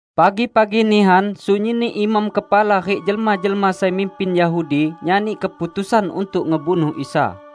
Pagi-pagi nihan, sunyinni imam kepala rik jelma-jelma sai mimpin Yahudi nyani keputusan untuk ngebunuh Isa.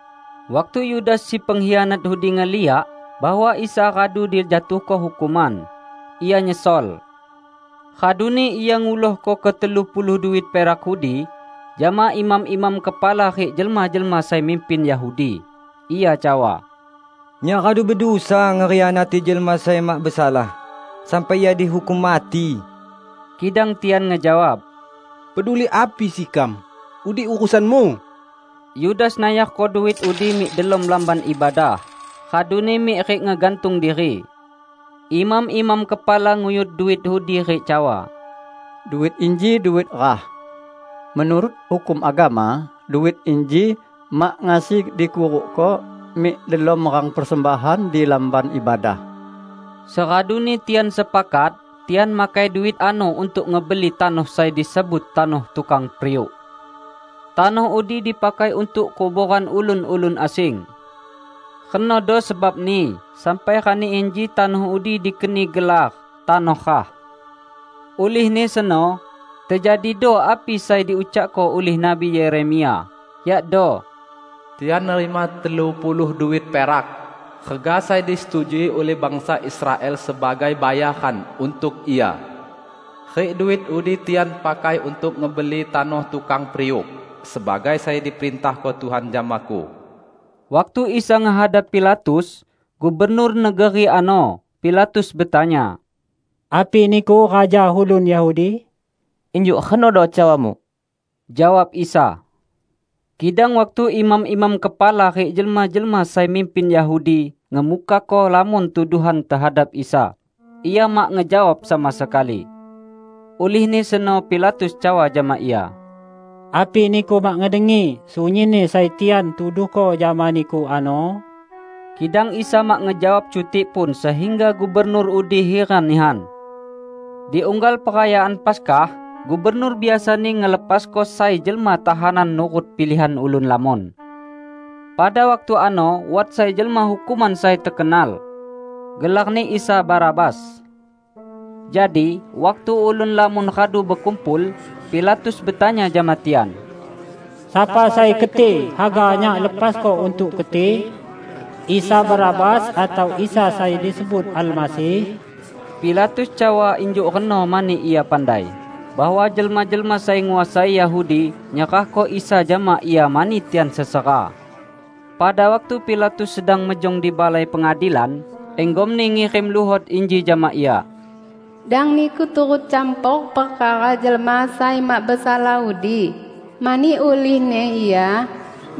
Waktu Yudas si pengkhianat udi ngeliak bahwa Isa radu dijatuhko hukuman, ia nyesol. Raduni ia ngulohko ketelu puluh duit perak udi jama imam-imam kepala rik jelma-jelma sai mimpin Yahudi. Ia cawa, "Nyak radu bedusa ngekhianati jelma sai mak besalah, sampai Ia dihukum mati!" Kidang tian ngejawab, "Peduli api sekam? Udi urusanmu!" Yudas nayarko duit udi mik delom Lamban Ibadah, raduni mik rik ngegantung diri. Imam-imam kepala nguyut duit udi rik cawa, "Duit inji duit rah. Menurut hukum agama, duit inji mak ngasi dikurukko mik delom rang persembahan di Lamban Ibadah." Seraduni tian sepakat, tian makai duit ano untuk ngebeli tanoh sai disebut Tanoh Tukang Periuk. Tanoh udi dipakai untuk kuboran ulun-ulun asing. Renodo sebabni sampai rani inji tanoh udi dikeni gelar "Tanoh Rah". Ulihni seno, tejadido api sai diucakko ulih Nabi Yeremia, yakdo, "Tian nerima telu puluh duit perak, rega sai disetujui ulih bangsa Israel sebagai bayaran untuk Ia. Rik duit udi tian pakai untuk ngebeli Tanoh Tukang Periuk, sebagai sai diperintahko Tuhan jamaku." Waktu Isa ngehadap Pilatus, gubernur negeri ano, Pilatus betanya, "Api Niku raja ulun Yahudi?" "Injuk renodo cawamu," jawab Isa. Kidang waktu imam-imam kepala rik jelma-jelma sai mimpin Yahudi ngemukako lamon tuduhan tehadap Isa, Ia mak ngejawab sama sekali. Ulihni seno Pilatus cawa jama Ia, "Api Niku mak ngedengi sunyinni sai tian tuduhko jama Niku ano?" Kidang Isa mak ngejawab cutikpun sehingga gubernur udi hiran nihan. Di unggal Perayaan Paskah, gubernur biasani ngelepasko sai jelma tahanan nurut pilihan ulun lamon. Pada waktu ano wat sai jelma hukuman sai tekenal. Gelarni Isa Barabas. Jadi, waktu ulun lamon radu bekumpul, Pilatus betanya jama tian, "Sapa sai keti haga nyak lepasko untuk keti? Isa Barabas atau Isa sai disebut Almasih?" Pilatus cawa injuk reno mani ia pandai, bahwa jelma-jelma sai nguasai Yahudi nyerahko Isa jama ia mani tian sesera. Pada waktu Pilatus sedang mejong di balai pengadilan, inggomni ngirim luhot inji jama ia, "Dang niku turut campor perkara jelma sai mak besalah udi, mani ulihni Ia,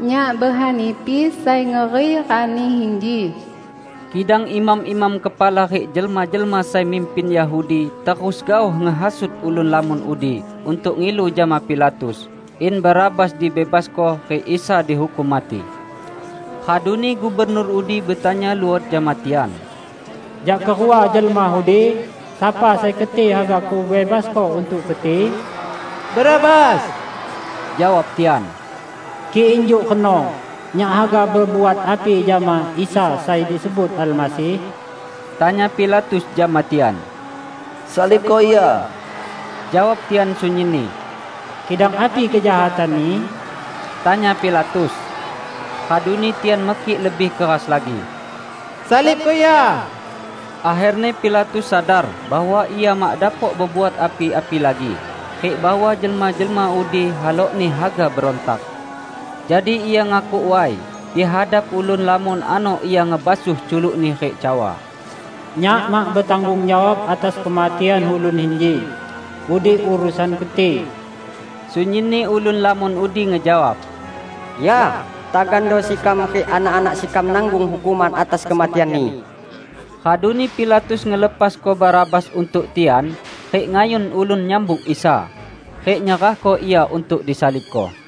nyak behanipi sai ngeri rani inji." Kidang imam-imam kepala rik jelma-jelma sai mimpin Yahudi terus gaoh ngehasut ulun lamon udi untuk ngilu jama Pilatus in Barabas dibebasko rik Isa dihukum mati. Raduni gubernur udi betanya luot jama tian, "Jak kerua jelma udi, sapa sai keti haga kubebasko untuk keti?" "Barabas," jawab tian. "Kik injuk reno, nyak haga bebuat api jama Isa sai disebut Almasih?" tanya Pilatus jama tian. "Salibko Ia!" jawab tian sunyinni. "Kidang api kejahatan-Ni?" tanya Pilatus. Raduni tian mekik lebih keras lagi, "Salibko Ia!" Akherni Pilatus sadar bahwa ia mak dapok bebuat api-api lagi rik bahwa jelma-jelma udi halokni haga berontak. Jadi ia ngakuk way, di hadap ulun lamon ano ia ngebasuh culukni rik cawa, "Nyak mak betanggung jawab atas kematian ulun inji! Udi urusan keti!" Sunyinni ulun lamon udi ngejawab, "Ya, tagando sekam rik anak-anak sekam nanggung hukuman atas kematian-Ni!" Raduni Pilatus ngelepasko Barabas untuk tian, rik ngayun ulun nyambuk Isa; rik nyerahko Ia untuk disalibko.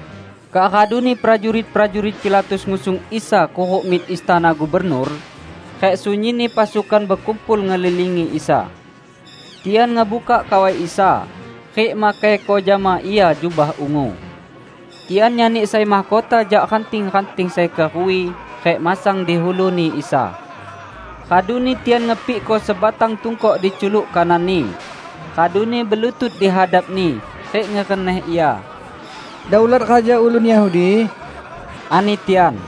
Kak raduni prajurit-prajurit Pilatus ngusung Isa kuruk mik istana gubernur, rik sunyinni pasukan bekumpul ngelilingi Isa. Tian ngebukak kawai Isa, rik makaiko jama Ia jubah ungu. Tian nyani sai mahkota jak ranting-ranting sai keruwi, rik masang di ulu-Ni Isa. Raduni tian ngepikko sebatang tungkok di culuk kanan-Ni, raduni belutut di hadap-Ni rik ngereneh Ia. "Daulat Raja Ulun Yahudi!" ani tian.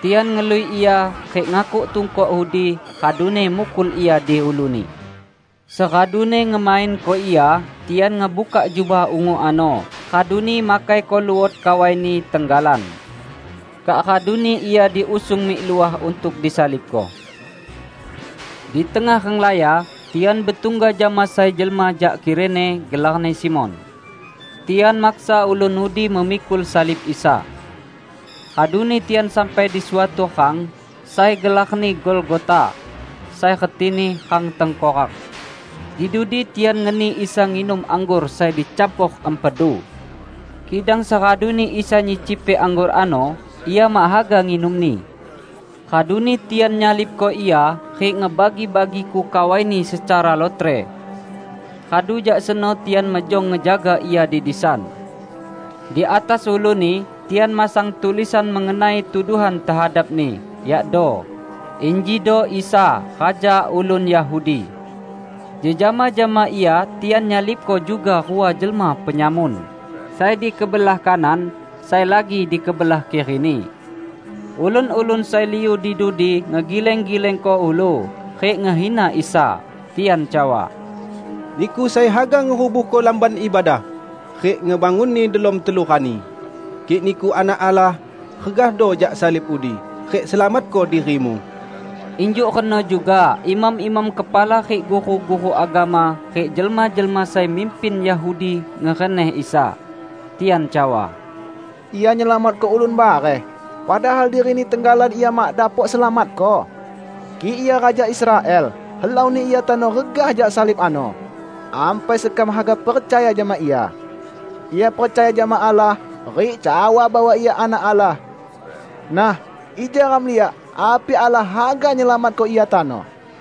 Tian ngelui Ia, rik ngakuk tungkok udi, raduni mukul Ia di ulu-Ni. Seraduni ngemainko Ia, tian ngebukak jubah ungu ano raduni makaiko luot kawai-Ni tenggalan. Kak raduni Ia diusung mik luah untuk disalibko. Di tengah renglaya, tian betungga jama sai jelma jak Kirene gelarni Simon. Tian maksa ulun udi memikul salib Isa. Raduni tian sampai di suatu rang sai gelarni Golgota, sai retini "Rang Tengkorak". Di dudi tian ngeni Isa nginum anggor sai dicampor empedu. Kidang seraduni Isa nyicipi anggor ano, Ia mak haga nginumni. Raduni tian nyalibko Ia, rik ngebagi-bagiko kawai-Ni secara lotre. Radu jak seno tian mejong ngejaga Ia di disan. Di atas ulu-Ni tian masang tulisan mengenai tuduhan tehadap-Ni, yakdo: "Injido Isa, Raja Ulun Yahudi." Jejama jama Ia tian nyalibko juga rua jelma penyamun; sai di kebelah kanan, sai lagi di kebelah kiri-Ni. Ulun-ulun sai liu di dudi ngegileng-gilengko ulu, rik ngehina Isa. Tian cawa, "Niku sai haga ngerubuhko Lamban Ibadah, rik ngebangunni delom telu rani! Kik Niku Anak Allah, regahdo jak salib udi, rik selamatko diri-Mu!" Injuk reno juga imam-imam kepala rik guru-guru agama rik jelma-jelma sai mimpin Yahudi ngereneh Isa. Tian cawa, "Ia nyelamatko ulun bareh, padahal diri-Ni tenggalan Ia mak dapok selamatko! Kik Ia raja Israel, helauni Ia tano regah jak salib ano, ampai sekam haga percaya jama Ia. Ia percaya jama Allah, rik cawa bahwa Ia Anak Allah. Nah, ija ram liak api Allah haga nyelamatko Ia tano."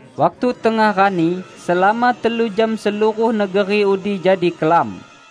Waktu tengah rani, selama telu jam seluruh negeri udi jadi kelam.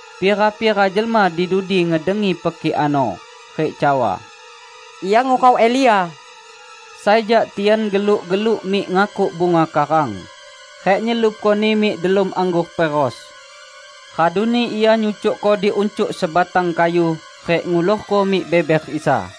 Pira-pira jelma di dudi ngedengi pekik ano, rik cawa, "Ia ngurau Elia!" Sai jak tian geluk-geluk mik ngakuk bunga karang, rik nyelupkoni mik delom anggor peros. Raduni ia nyucukko di uncuk sebatang kayu, rik ngulorko mik beber Isa.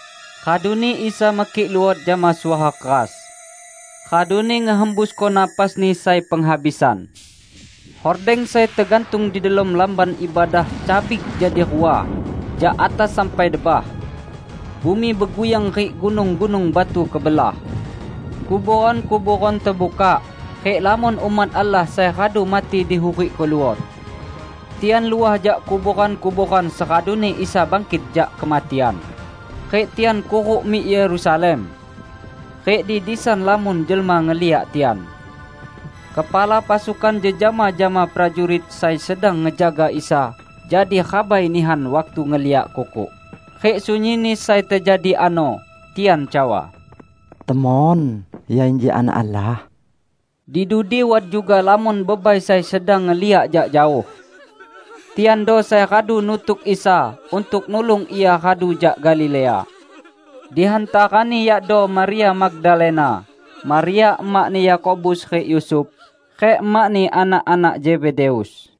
Raduni Isa mekik luot jama suara keras, raduni ngehembusko napas-Ni sai penghabisan. Hordeng sai tegantung di delom Lamban Ibadah cabik jadi rua jak atas sampai debah. Bumi beguyang rik gunung-gunung batu kebelah. Kuboran-kuboran tebukak, rik lamon umat Allah sai radu mati dihurikko luot. Tian luah jak kuboran-kuboran seraduni Isa bangkit jak kematian, rik tian kuruk mik Yerusalem. Rik di disan lamon jelma ngeliak tian. Kepala pasukan jejama jama prajurit sai sedang ngejaga Isa jadi rabai nihan waktu ngeliak kukuk, rik sunyinni sai tejadi ano. Tian cawa, "Temon, Ia inji Anak Allah!" Di dudi wat juga lamon bebai sai sedang ngeliak jak jaoh. Tiando sai radu nutuk Isa untuk nulung Ia radu jak Galilea. Di hantarani yakdo Maria Magdalena, Maria emakni Yakobus rik Yusuf, rik emakni anak-anak Zebedeus.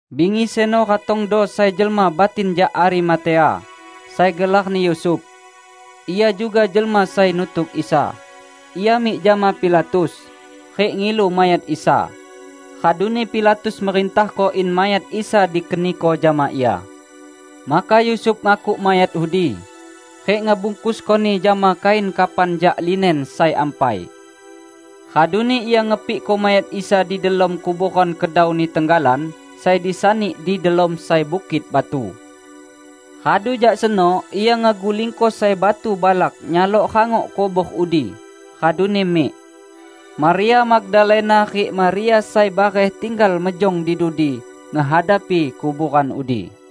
Bingi seno ratongdo sai jelma batin jak Arimatea, sai gelarni Yusuf. Ia juga jelma sai nutuk Isa. Ia mik jama Pilatus, rik ngilu mayat Isa. Raduni Pilatus merintahko in mayat Isa dikeniko jama ia. Maka Yusuf ngakuk mayat udi, rik ngebungkuskoni jama kain kafan jak linen sai ampai. Raduni ia ngepikko mayat Isa di delom kuboran kedauni tenggalan sai disani di delom sai bukit batu. Radu jak seno ia ngegulingko sai batu balak nyalok rangok kubor udi, raduni mik. Maria Magdalena rik Maria sai bareh tinggal mejong di dudi ngehadapi kuboran udi.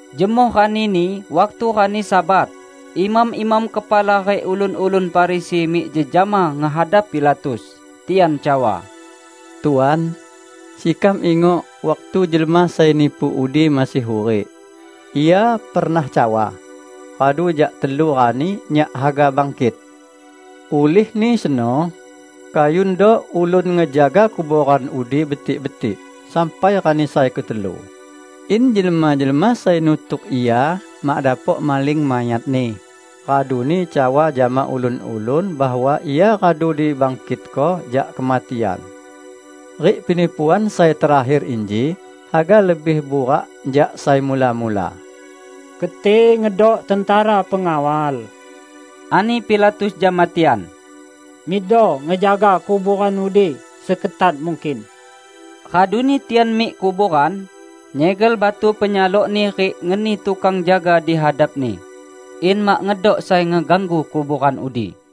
Jemoh ranini, waktu rani Sabat, imam-imam kepala rik ulun-ulun Farisi mik jejama ngehadap Pilatus tian cawa, "Tuan, sekam ingok waktu jelma sai nipu udi masih hurik, Ia pernah cawa, 'Radu jak telu rani Nyak haga bangkit.' Ulihni seno, kayundo ulun ngejaga kuboran udi betik-betik sampai rani sai ketelu, in jelma-jelma sai nutuk Ia mak dapok maling mayat-Ni raduni cawa jama ulun-ulun bahwa Ia radu dibangkitko jak kematian. Rik penipuan sai terakher inji haga lebih burak jak sai mula-mula." "Keti ngedok tentera pengawal," ani Pilatus jama tian, "mikdo ngejaga kuboran udi seketat mungkin." Raduni tian mik kuboran, nyegel batu penyalokni rik ngeni tukang jaga di hadapni, in mak ngedok sai ngeganggu kuboran udi.